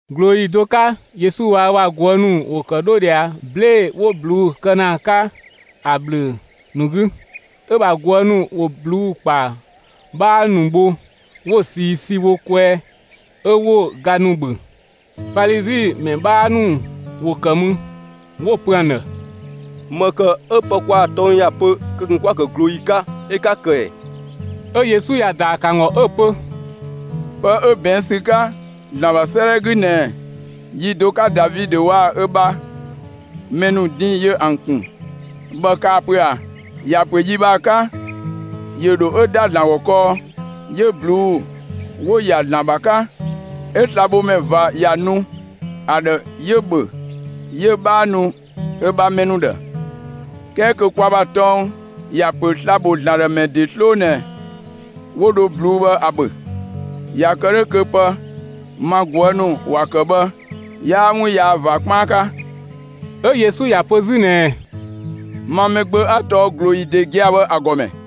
꞊Glooyi do 'ka Yesu waa‑ ö ‑bha ꞊guë' ‑nu ‑wo ‑kë bɔ ꞊dhia 'blee‑ 'wo ꞊bluu'‑ kë ‑na ‑a 'ka ‑a ‑bhlö ‑nu 'gü. 'Ö‑ ‑bha ꞊guë' ‑nu ‑wo ꞊bluu'‑ ‑kpa 'bhaa ‑nu bho 'wo‑ ꞊sii si wo kwɛɛ 'ö 'wo‑ ga ‑nu ‑bhö. Falizi ‑mɛ 'bhaa ‑nu ‑wo ‑kë mü, 'wo‑ pö ‑an ‑dhë: «‑Më ‑kë 'ö pë kwaa‑ tɔng ‑ya pö kö ꞊kun 'kwa‑ ‑kë ꞊glooyi 'ka 'ö 'ka‑ ‑kë ‑ɛ?» 'Ö Yesu ‑ya ‑daa ‑kë ‑an ‑gɔ 'ö‑ pö: «Pë 'ö ꞊bɛɛn' ‑sü 'ka ‑Zlan ‑bha 'sëëdhɛ 'gü ꞊nɛɛ, yi do 'ka Davidö waa‑ ö bha mɛ ‑nu din ‑yö ‑an ‑kun bhë kaa‑ pö ꞊a? ‑Ya ‑pö yi bhë ‑a 'ka ‑yö ‑dho 'yö ‑da ‑Zlan ‑gɔ kɔɔ, 'yö ꞊bluu'‑ 'wo‑ ‑ya ‑Zlan ‑bha 'ka bhë 'ö slabhomɛ ꞊va ‑ya nu ‑a ‑dhë 'yö‑ ‑bhö 'yö‑ 'bhaa nu ö bha mɛ ‑nu ‑dhë, 'kɛɛ kö kwa ‑bha tɔng ‑ya ‑pö sla‑ ‑bho ‑Zlan ‑dhë ‑mɛ ‑nu ‑de 'sloo ꞊nɛ 'wo dho ꞊bluu'‑ bhë ‑a ‑bhö. ꞊Ya kë 'dhö kö pë ma ꞊guë' ‑nu ‑wa ‑kë bhë, 'yaa 'wun yaa ꞊va 'kpaan 'ka.» 'Ö Yesu ‑ya pö 'zü ꞊nɛɛ: «Ma Mɛgbö, 'a tɔɔ ꞊glooyi ‑de gia‑ bhë ‑a ‑gɔmɛ.»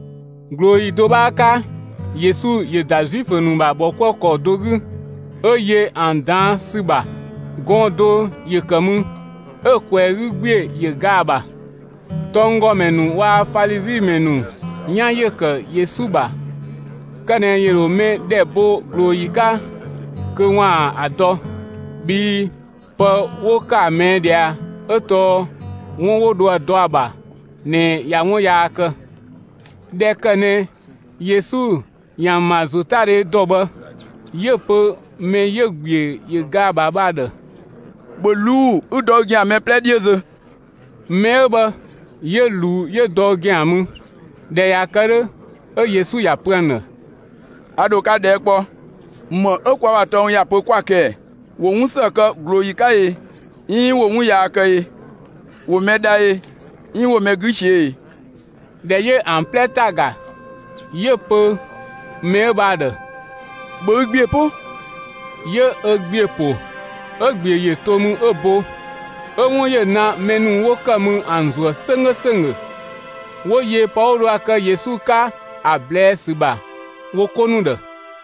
꞊Glooyi do 'bhaa 'ka Yesu ‑yö ‑da Zuifö ‑nu ‑bha ‑bhɔkuëkɔ do 'gü, 'ö yö ‑an ꞊daan' ‑sü ‑bha. Gɔɔn‑ do ‑yö ‑kë mü, 'ö‑ ꞊kwɛɛ‑ 'gü ‑gbiö ‑yö ga ‑a ‑bha. Tɔnggɔmɛ ‑nu waa‑ Falizi ‑mɛ ‑nu 'yan ‑yö ‑kë Yesu ‑bha, kë ꞊nɛ ‑yö ‑dho mɛ ‑dhɛ bo ꞊glooyi 'ka kö ‑waan ‑a dɔ, bhii pë 'wo ‑kë ‑a ꞊mɛɛ' ꞊dhia 'ö tɔɔ 'wun 'wo dho ‑a dɔ ‑a ‑bha ꞊nɛ ꞊ya 'wun yaa kë. ꞊Dhɛ ‑kë ꞊nɛ Yesu ‑yö ‑an ‑bha ‑zotadhe ‑dɔ bhë, 'yö‑ pö mɛ 'yö‑ ‑gbiö ‑yö ga ‑a ‑bha bhë ‑a ‑dhë: «‑Bhö ꞊luu'‑ 'ü dɔ ü ‑gɛan mɛ 'plɛ 'dhiö zö!» Mɛ 'ö bhë 'yö ꞊luu 'yö dɔ ö ‑gɛan mü. ꞊Dhɛ ꞊ya kë 'dhö, 'ö Yesu ‑ya pö ‑an ‑dhë: «A ‑dho ka ꞊dhɛɛ' kpɔ: ‑Më 'ö kwa ‑bha tɔng ‑ya pö 'kwa‑ kë ꞊ɛ? ‑Wo 'wun ‑së kë ꞊glooyi 'ka i 'iin ‑wo 'wun yaa kë e? ‑Wo mɛ dha ꞊i 'iin ‑wo mɛ 'gü ꞊siö'‑ e?» ꞊Dhɛ 'yö ‑an 'plɛ ‑ta ‑ga, 'yö‑ pö mɛ 'ö bhë ‑a ‑dhë: «‑Bhö ü ‑gbiö 'po!» 'Yö ö ‑gbiö ‑po 'ö‑ ‑gbiö ‑yö to mü 'ö bo. 'Ö 'wun ‑yö ‑na mɛ ‑nu 'wo ‑kë mü ‑an ‑zuë 'sönggö ‑sönggö, 'wo yö pë 'wo dho ‑a kë Yesu 'ka ‑a ꞊blɛɛ' ‑sü ‑bha wo 'ko ‑nu ‑dhë.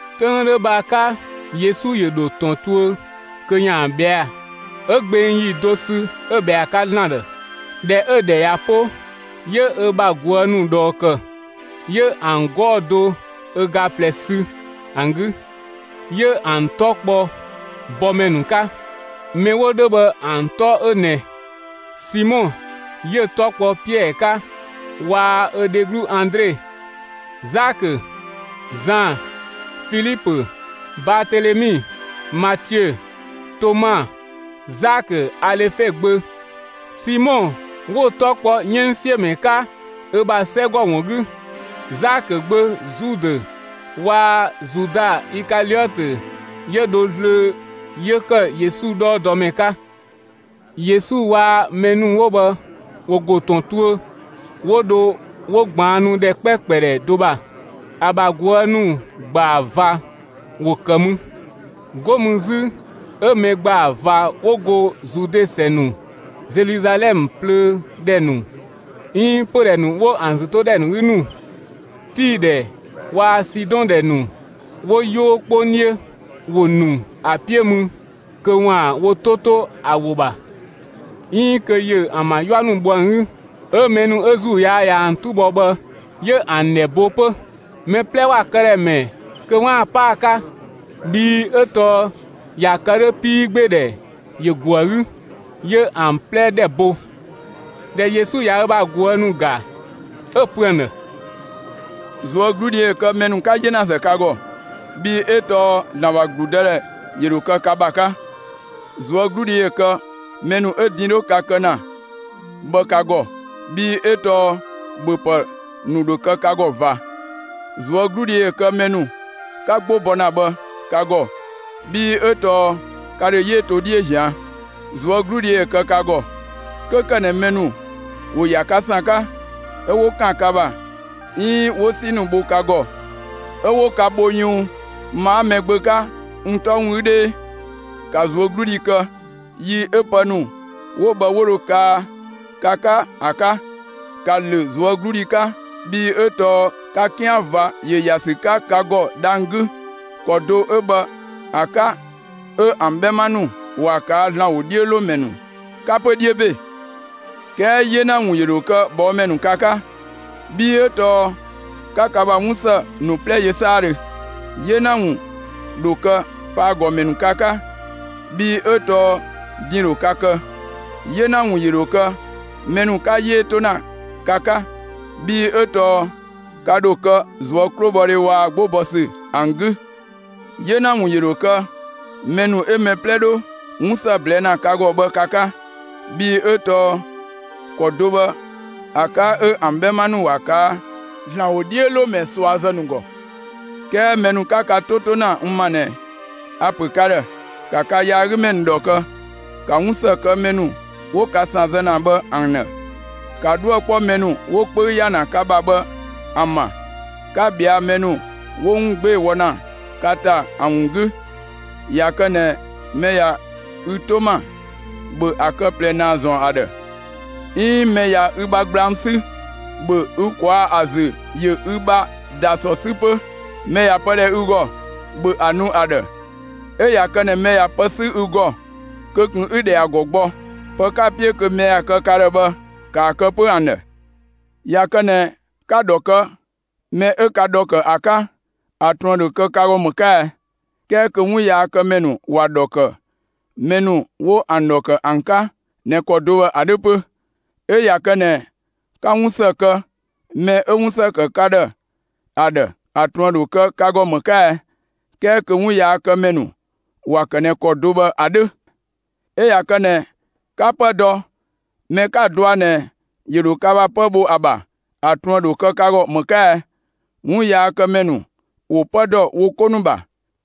'Töng 'ö 'dhö bhë ‑a 'ka, Yesu ‑yö ‑dho ‑tɔn tuö kö ‑yaan ꞊bhɛa'‑; 'ö gbeng ‑yi do sü 'ö ꞊bhɛa ‑a 'ka ‑Zlan ‑dhë. ꞊Dhɛ 'ö‑ ‑dhɛ ꞊ya 'po, 'yö ö bha ꞊guë' ‑nu ꞊dhɔɔ ‑kë, 'yö ‑an 'gɔɔ‑ do ö ga ꞊plɛ sü ‑an 'gü; 'yö ‑an 'tɔ kpɔ bɔmɛ ‑nu 'ka. Mɛ 'wo 'dhö bhë ‑an 'tɔ 'ö ꞊nɛ: Simɔ 'yö‑ 'tɔ kpɔ Piɛɛ 'ka waa‑ ö dheglu Andre, Zakö, Zan, Filipö, Baatelemi, Matiö, Toma, Zakö Alefe gbö, Simɔ 'wo‑ 'tɔ kpɔ 'yënngsiömɛ 'ka ö ‑bha 'sɛgɔ ‑wun 'gü. Zakö gbö Zudë waa‑ Zuda Ikaliɔtö 'yö dho zlöö 'yö ‑kë Yesu 'dhɔɔdɔmɛ 'ka. Yesu waa‑ mɛ ‑nu 'wo bhë ‑wo ‑go ‑tɔn tuö 'wo dho 'wo ꞊gbaannu ‑dhɛ 'kpɛkpɛ ‑dhɛ do ‑bha. ‑A ‑bha ꞊guë' ‑nu ‑gbaa ꞊va ‑wo ‑kë mü. 'Go mü 'zü 'ö mɛ ‑gbaa ꞊va 'wo go Zude ‑sɛ ‑nu, Zeluzalɛmë plöö ‑dhɛ ‑nu 'iin pödhɛ ‑nu 'wo ‑an ‑zütodhɛ ‑nu 'gü ‑nu, Tii ‑dhɛ waa‑ Sidɔn ‑dhɛ ‑nu 'wo 'yoo 'kpong 'dhiö, ‑wo ‑nu ‑a 'piö mü kö 'waan‑ wo 'to 'to ‑a ‑wo ‑bha, 'iin kö ‑yö ‑an ‑bha 'yua ‑nu bho ‑an 'gü. 'Ö mɛ ‑nu 'ö ‑zuu yaa ꞊ya ‑an 'tu bɔ bhë 'yö ‑an ‑dhɛ bo 'pö. Mɛ 'plɛ ‑wa këdhɛ ‑mɛɛ kö 'waan‑ 'pa ‑a 'ka, bhii 'ö tɔɔ ꞊ya kë 'dhö 'piigbeedhɛ ‑yö ‑go ‑a 'gü, 'yö ‑an 'plɛ ‑dhɛ bo. ꞊Dhɛ Yesu ꞊ya ö bha ꞊guë' ‑nu ‑ga, 'ö‑ pö ‑an ‑dhë: «꞊Zuögludhi ‑yö kë mɛ ‑nu 'ka 'yenazë ka ‑gɔ, bhii 'ö tɔɔ ‑Zlan ‑bha ‑gludëdhɛ ‑yö ‑dho kë ka ‑bha 'ka. ꞊Zuögludhi ‑yö kë mɛ ‑nu 'ö din 'dho ka kë ‑na bhë ka ‑gɔ, bhii 'ö tɔɔ ‑bhöpë ‑nu ‑dho kë ka ‑gɔ ꞊va. ꞊Zuögludhi ‑yö kë mɛ ‑nu 'ka 'gbo bɔ ‑na bhë ka ‑gɔ, bhii 'ö tɔɔ ka ‑dho 'yee to 'dhiö ꞊zian'. ꞊Zuögludhi ‑yö kë ka ‑gɔ, 'kö ‑kë ꞊nɛ mɛ ‑nu ‑wo ‑ya ka ‑san 'ka, 'ö 'wo ‑kan ka ‑bha, 'iin 'wo 'si ‑nu bho ka ‑gɔ, 'ö 'wo ka bho yunng, ma 'a Mɛgbö 'ka n 'tɔ ‑wun 'gü 'dhee! ‑Ka ꞊zuögludhi kë yi 'ö pë ‑nu 'wo bhë 'wo dho kaa ka 'ka ‑a 'ka; ‑ka ‑lö ꞊zuögludhi 'ka, bhii 'ö tɔɔ ka 'kian ꞊va ‑yö ‑ya ‑sü 'ka ka ‑gɔ dhang‑ 'gü. ‑Kɔ do 'ö bhë ‑a 'ka, 'ö ‑an 'bhɛma ‑nu ‑wa ꞊kaa' ‑Zlan ‑wodhiölomɛ ‑nu 'ka 'pö 'dhiö ‑be. 'Kɛɛ 'yena ‑wun ‑yö ‑dho kë ꞊bhɔɔmɛ ‑nu ka 'ka, bhii 'ö tɔɔ 'ka ka ‑bha 'wun ‑së ‑nu 'plɛ yö 'saadhö. 'Yena ‑wun ‑dho kë pëyagɔmɛ ‑nu ka 'ka, bhii 'ö tɔɔ din ‑yö ‑dho ka kë! 'Yena ‑wun ‑yö ‑dho kë mɛ ‑nu 'ka 'yee 'to ‑na ka 'ka, bhii 'ö tɔɔ ka ‑dho kë ꞊zuö' 'klobhɔdhe waa‑ 'gbo bɔ ‑sü ‑an 'gü! 'Yena ‑wun ‑yö ‑dho kë mɛ ‑nu 'ö mɛ 'plɛ 'dho 'wun ‑së ꞊blɛɛ' ‑na ka ‑gɔ bhë ka 'ka, bhii 'ö tɔɔ ‑kɔ do 'ö bhë ‑a 'ka 'ö ‑an 'bhɛma ‑nu ‑wa ꞊kaa' ‑Zlan ‑wodhiölomɛ ꞊suazë ‑nu ‑gɔ! 'Kɛɛ mɛ ‑nu 'ka ka 'to 'to ‑na n ‑ma ꞊nɛ, a‑ ‑pö ka ‑dhë: ‑Ka ka yaagümɛ ‑nu ‑dhɔ kë, 'ka 'wun ‑së kë mɛ ‑nu 'wo ka ‑san zë ‑na bhë ‑an ‑dhë. ‑Ka 'dhuë‑ 'kpɔ mɛ ‑nu 'wo 'wun 'kpöü ‑ya ‑na ka ‑bha bhë ‑an ‑bha, 'ka ꞊bhɛa'‑ mɛ ‑nu 'wo 'wun 'gbee‑ wɔ ‑na ka ‑ta bhë ‑an ‑wun 'gü. ꞊Ya kë ꞊nɛ mɛ ꞊ya ü 'to ‑ma, ‑bhö ‑a kë ꞊plɛ ‑naa ‑zɔn ‑a ‑dhë, 'iin mɛ ꞊ya ü bha gblang 'sü, ‑bhö ü ꞊kwaa' ‑a ‑zü ‑yö ü bha ‑dasɔ 'sü 'pö. Mɛ ꞊ya pë ‑dhɛ ü ‑gɔ, ‑bhö ‑a nu ‑a ‑dhë, 'ö ꞊ya kë ꞊nɛ mɛ ꞊ya pë 'sü ü ‑gɔ, kö ꞊kun 'ü‑ ‑dhɛ ‑a ‑gɔ gbɔ. Pë 'ka‑ 'piö kö mɛ ‑ya kë ka ‑dhë bhë, ‑kaa kë 'pö ‑an ‑dhë. ꞊Ya kë ꞊nɛ 'ka‑ ‑dhɔ kë mɛ 'ö ka ‑dhɔ ‑kë ‑a 'ka, ‑a ꞊truën ‑dho kë ka ‑gɔ ‑më 'ka ɛ? 'Kɛɛ kö 'wunyaakëmɛ ‑nu ‑wa ‑dhɔ ‑kë mɛ ‑nu 'wo ‑an ‑dhɔ ‑kë ‑an 'ka ꞊nɛ ‑kɔ do bhë ‑a 'dhö 'pö. 'Ö ꞊ya kë ꞊nɛ 'ka 'wun ‑së kë mɛ 'ö 'wun ‑së ‑kë ka ‑dhë ‑a ‑dhë, ‑a ꞊truën ‑dho kë ka ‑gɔ ‑më 'ka ɛ? 'Kɛɛ kö 'wunyaakëmɛ ‑nu ‑wa ‑kë ꞊nɛ ‑kɔ do bhë ‑a 'dhö! 'Ö ꞊ya kë ꞊nɛ 'ka 'pë dɔ mɛ 'ka‑ ꞊dɔa' ꞊nɛ, ‑yö ‑dho ka ‑bha 'pë bho ‑a ‑bha, ‑a ꞊truën ‑dho kë ka ‑gɔ ‑më 'ka ɛ? 'Wunyaakëmɛ ‑nu ‑wo 'pë ‑dɔ wo 'ko ‑nu ‑bha.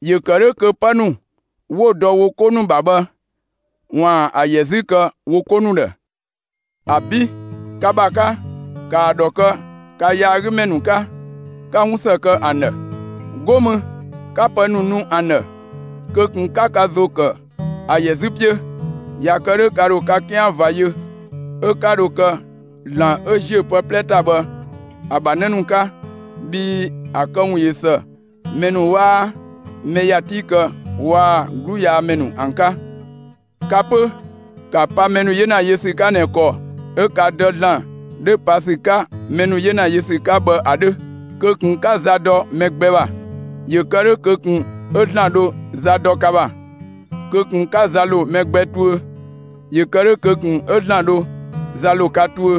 ‑Yö ‑kë 'dhö kö 'pë ‑nu 'wo‑ dɔ wo 'ko ‑nu ‑bha bhë, ‑waan ‑a ‑yɛ 'zü kë wo 'ko ‑nu ‑dhë! ‑Abi'! Ka ‑bha 'ka, ‑kaa ‑dhɔ kë ka yaagümɛ ‑nu 'ka, 'ka 'wunsë kë ‑an ‑dhë. 'Go mü 'ka pë ‑nu nu ‑an ‑dhë, kö ꞊kun 'ka ka ‑zo ‑kë ‑a ‑yɛ 'zü 'piö. ꞊Ya kë 'dhö ka ‑dho ka 'kian ꞊va yö, 'ö 'ka dho kë ‑Zlan 'ö ‑ziö pë 'plɛ ‑ta bhë ‑a ‑bha 'në ‑nu 'ka, bhii ‑a këwun ꞊yö ‑së mɛ ‑nu 'waa mɛ ‑ya 'ti kë waa‑ 'gluyaamɛ ‑nu ‑an 'ka. Ka 'pö, ‑ka pa mɛ ‑nu 'yena yö ‑sü 'ka ꞊nɛ ‑kɔ 'ö ka Dë ‑Zlan 'dho pa ‑sü 'ka mɛ ‑nu 'yena yö ‑sü 'ka bhë ‑a 'dhö! Kö ꞊kun 'ka za dɔ mɛ gbɛ ‑bha, ‑yö ‑kë 'dhö kö ꞊kun 'ö ‑Zlan ‑dho za dɔ ka ‑bha. Kö ꞊kun 'ka za ‑lo mɛ gbɛ tuö, ‑yö ‑kë 'dhö kö ꞊kun 'ö ‑Zlan dho za ‑lo ka tuö.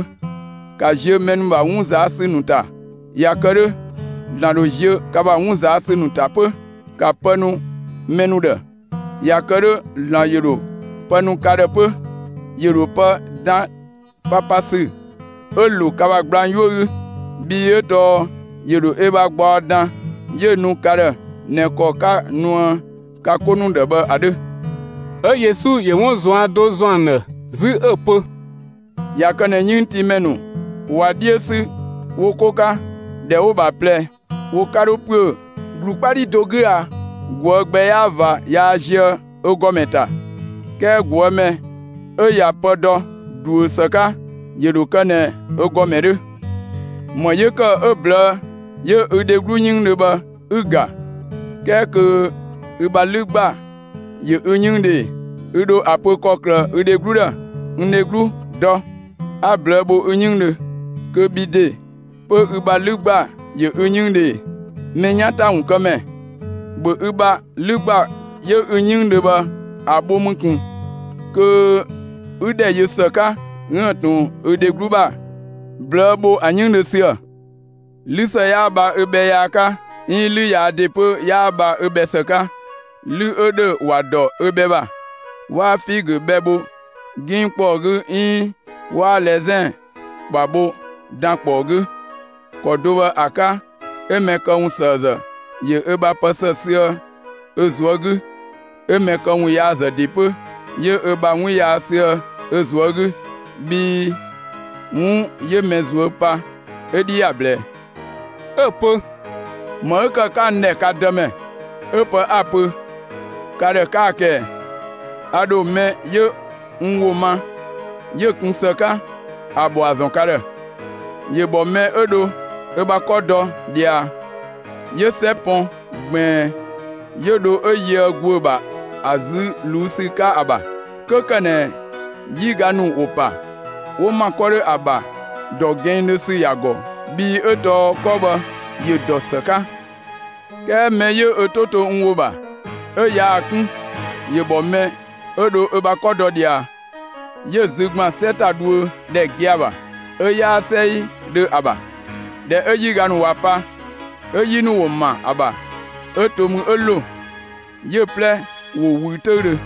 ‑Ka ziö mɛ ‑nu ‑bha 'wun ꞊zaa' ‑sü ‑nu ‑ta, ꞊ya kë 'dhö, ‑Zlan dho ziö ka ‑bha 'wun ꞊zaa' ‑sü ‑nu ‑ta 'pö. ‑Ka pë nu mɛ ‑nu ‑dhë, ꞊ya kë 'dhö ‑Zlan ‑yö ‑dho pë nu ka ‑dhë 'pö; ‑yö ‑dho pë dan papasü 'ö‑ ‑lo ka ‑bha gblang 'yuö‑ 'gü, bhii 'ö tɔɔ ‑yö ‑dho ö bha gbaɔ dan 'yö‑ nu ka ‑dhë ꞊nɛ ‑kɔ 'ka‑ nuë ka 'ko ‑nu ‑dhë bhë ‑a 'dhö.» 'Ö Yesu ‑yö 'wun ꞊zuan' do ‑zɔn ‑an ‑dhë 'zü 'ö‑ pö: «꞊Ya kë ꞊nɛ 'yënngtiimɛ ‑nu ꞊wa 'dhiö ‑sü wo 'ko 'ka, ‑dhɛ 'wo‑ ‑bha ꞊plɛ wo 'ka 'dho ‑püö ‑glu 'kpa 'dhi do 'gü a? ꞊Guë' gbɛ 'yaa ꞊va yaa zië ö ‑gɔmɛ ‑ta, 'kɛɛ ꞊guë' mɛ 'ö ꞊ya pë dɔ ꞊duö ‑së 'ka, ‑yö ‑dho kë ꞊nɛ ö ‑gɔmɛ 'dhö. ‑Më 'yö‑ ‑kë 'ö ꞊blëë' 'yö ü dheglu 'yënngdhö bhë 'ü‑ ‑ga, 'kɛɛ kö ü ‑bha 'lü ‑gba ‑yö ü 'yënngdhö ꞊e? Ü ‑dho ‑a pö ‑kɔklë ü dheglu ‑dhë: ‹N dheglu, dɔ! 'A ꞊blëë' bho ü 'yënngdhö›, kö bhi ‑de 'pö ü ‑bha 'lü ‑gba ‑yö ü 'yënngdhö ꞊e? Mɛ 'yan ‑ta ‑wun kë ‑mɛ, ‑bhö ü ‑bha 'lü ‑gba 'yö ü 'yënngdhö bhë ‑a bho mü ꞊kun kö 'ü ‑dhɛ yö ‑së 'ka 'üën‑ ꞊tun ü dheglu ‑bha ꞊blëë' bho ‑a 'yënngdhö ‑süë. 'Lü ‑së 'yaa bha ö bhɛ yaa 'ka 'iin 'lü yaa ‑de 'pö 'yaa bha ö bhɛ ‑së 'ka. 'Lü 'ö ‑dhö ‑wa ‑dɔ ö bhɛ ‑bha. 'Waa figö bhɛ bho 'ginng ‑kpɔɔ 'gü 'iin 'waa lɛzɛn ‑kpa bho dankpɔɔ 'gü. ‑Kɔ do bhë ‑a 'ka 'ö mɛ këwunsëëzë ‑yö ö ‑bha pë ‑së sü ö ꞊zuö' 'gü, 'ö mɛ këwunyaazë ‑de 'pö 'yö ö bha 'wun yaa sü ö ꞊zuö' 'gü, bhii 'wun 'yö mɛ ꞊zuö' pa, ö 'dhi ‑ya ꞊blɛɛ.» 'Ö‑ pö: «‑Më 'ö ‑kë 'ka n ‑dhɛ ka Dëmɛ, 'ö pë 'a‑ pö ka ‑dhë 'kaa‑ kë ꞊ɛ? A ‑dho mɛ 'yö n ‑wo ma 'yö‑ kun ‑së 'ka, ‑a ‑bhɔa ‑zɔn ka ‑dhë: ‑Yö ‑bhɔ mɛ 'ö dho ö bha 'kɔ dɔ ꞊dhia, 'yö 'sɛ pɔn ꞊gbiin, 'yö dho 'ö yöë ‑guö ‑bha ‑a zü ꞊luu'‑ ‑sü 'ka ‑a ‑bha. 'Kö ‑kë ꞊nɛ 'yiga ‑nu ‑wo ‑pa, 'wo ‑ma 'kɔ 'dhö bhë ‑a ‑bha, ‑dɔ gɛnngdhö ‑sü ‑ya ‑gɔ, bhii 'ö tɔɔ 'kɔ bhë ‑yö ‑dɔ ‑së 'ka. 'Kɛɛ mɛ 'yö ö 'to to n ‑wo ‑bha 'ö yaa‑ 'kun, ‑yö ‑bhɔ mɛ 'ö dho ö bha 'kɔ dɔ ꞊dhia, 'yö‑ zü ‑gban 'sɛ ‑ta dhuö ‑dhɛ gia‑ ‑bha 'ö 'yaa 'sɛidhö ‑a ‑bha. ꞊Dhɛ 'ö 'yiga ‑nu ꞊wa pa, 'ö 'yi ‑nu ‑wo ‑ma ‑a ‑bha 'ö to mü 'ö ‑lo; 'yö‑ 'plɛ ‑yö ꞊wüü 'töüdhö.»